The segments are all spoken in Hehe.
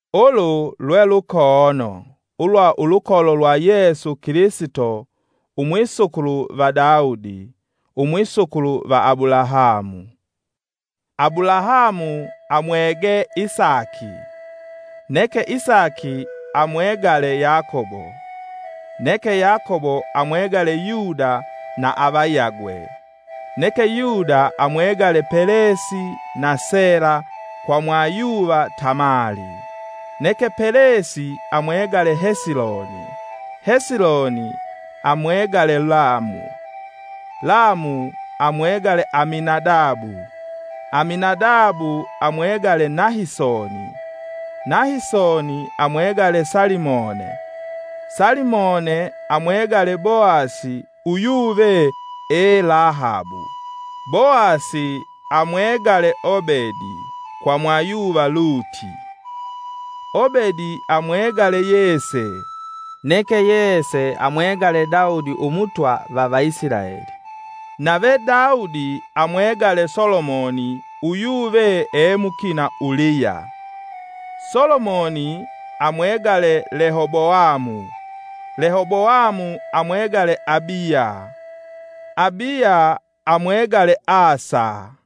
Ulu lwe lukoono ulwa ulukolo lwa Yesu Kilisito umwisukulu va Daudi, umwisukulu va Abulahamu: Abulahamu amwege Isaki, neke Isaki amwegale Yakobo, neke Yakobo amwegale Yuda na avayagwe, neke Yuda amwegale Pelesi na Sela, kwa mwayuva Tamali, neke Pelesi amwegale Hesiloni, Hesiloni, amwegale Lamu, Lamu amwegale Aminadabu, Aminadabu amwegale Nahisoni, Nahisoni amwegale Salimone, Salimone amwegale Boasi uyuve ee Lahabu, Boasi amwegale Obedi kwa mwayuva Luti, Obedi amwegale Yese, neke Yese amwegale Daudi Umutwa va Vaisilaeli. Nave Daudi amwegale Solomoni uyuve ee mukina Uliya. Solomoni amwegale Lehoboamu, Lehoboamu amwegale Abiya, Abiya amwegale Asa,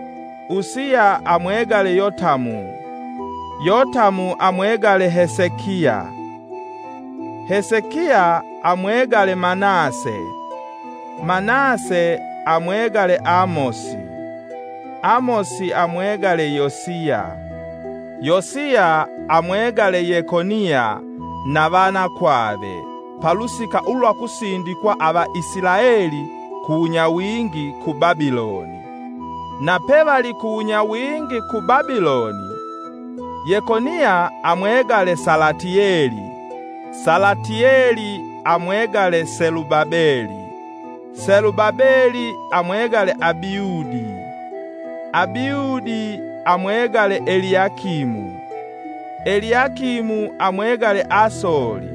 Usiya amwegale Yotamu, Yotamu amwegale Hesekia. Hesekia amwegale Manase, Manase amwegale Amosi, Amosi amwegale Yosiya, Yosiya amwegale Yekoniya na vanakwave, palusika ulwa kusindikwa ava Isilaeli kuwunyawingi ku Babiloni. Napevali kuwunyawingi ku Babiloni: Yekoniya amwegale Salatieli, Salatieli amwegale Selubabeli, Selubabeli amwegale Abiudi, Abiudi amwegale Eliakimu, Eliakimu amwegale Asoli.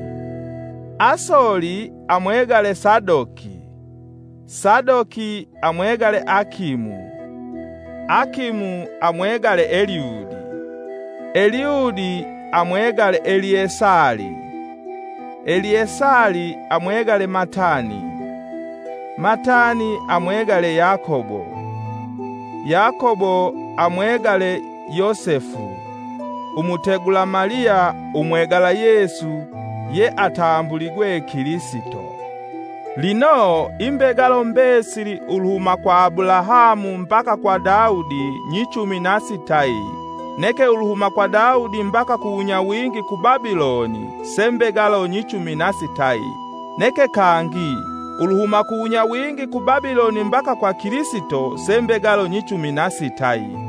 Asoli amwegale Sadoki, Sadoki amwegale Akimu, Akimu amwegale Eliudi, Eliudi amwegale Eliesali, Eliesali amwegale Matani, Matani amwegale Yakobo, Yakobo amwegale Yosefu umutegula Maliya umwegala Yesu ye atambuligwe Kilisito. Lino imbegalo mbesili uluhuma kwa Abulahamu mbaka kwa Daudi nyichumi nasitayi neke uluhuma kwa Daudi mbaka kuwunyawingi ku Babiloni se mbegalo nyichumi nasitayi, neke kangi, uluhuma kuwunyawingi ku Babiloni mbaka kwa Kilisito se mbegalo nyichumi nasitayi.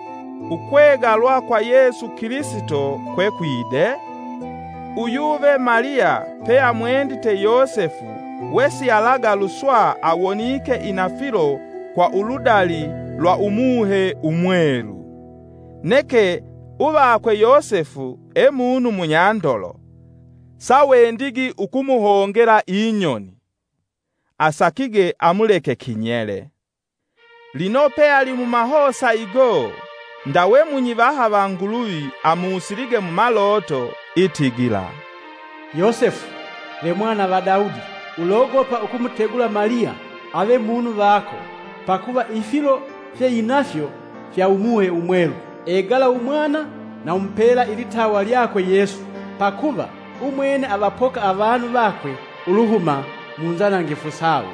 Ukwegalwa kwa Yesu Kilisito kwekwide: Uyuve Maliya pe amwendite Yosefu wesialagaluswa awonike inafilo kwa uludali lwa Umuhe Umwelu; Neke uvakwe Yosefu, emunu munyandolo sawendigi ukumuhongela inyoni, asakige amuleke kinyele. Lino peali mumahosa igo, ndawe munyivaha va Nguluvi amusilige mumaloto, itigila, “Yosefu, ve Mwana va Daudi, ulogopa ukumutegula Maliya ave munu vako, pakuva ifilo fye inafyo fya Umuhe Umwelu. Egala umwana na umupela ilitawa lyakwe Yesu, pakuva umwene avapoka avanu vakwe uluhuma mu nzanangifu sawo.”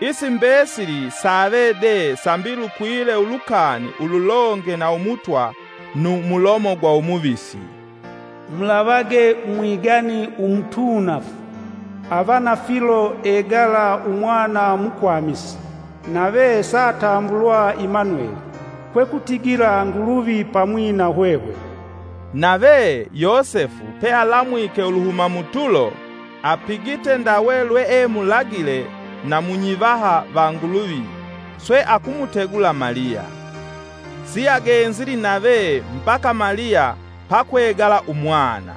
Isi mbesili saave de sambi lukwile ulukani ululonge na umutwa numulomo gwa umuvisi: “Mulavage Umwigani umutuunafu avanafilo egala umwana mukwamisi, nave saatambulwa Imanueli” (kwekutigila, “Nguluvi pamwi na hwehwe.”) Nave, Yosefu pealamwike uluhuma mutulo apigite ndawe lweemulagile na munyivaha va Nguluvi swe akumutegula Maliya. Siagenzili nave mbaka Maliya pakwegala umwana.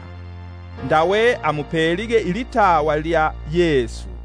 Ndawe amupelige ilitawa lya Yesu.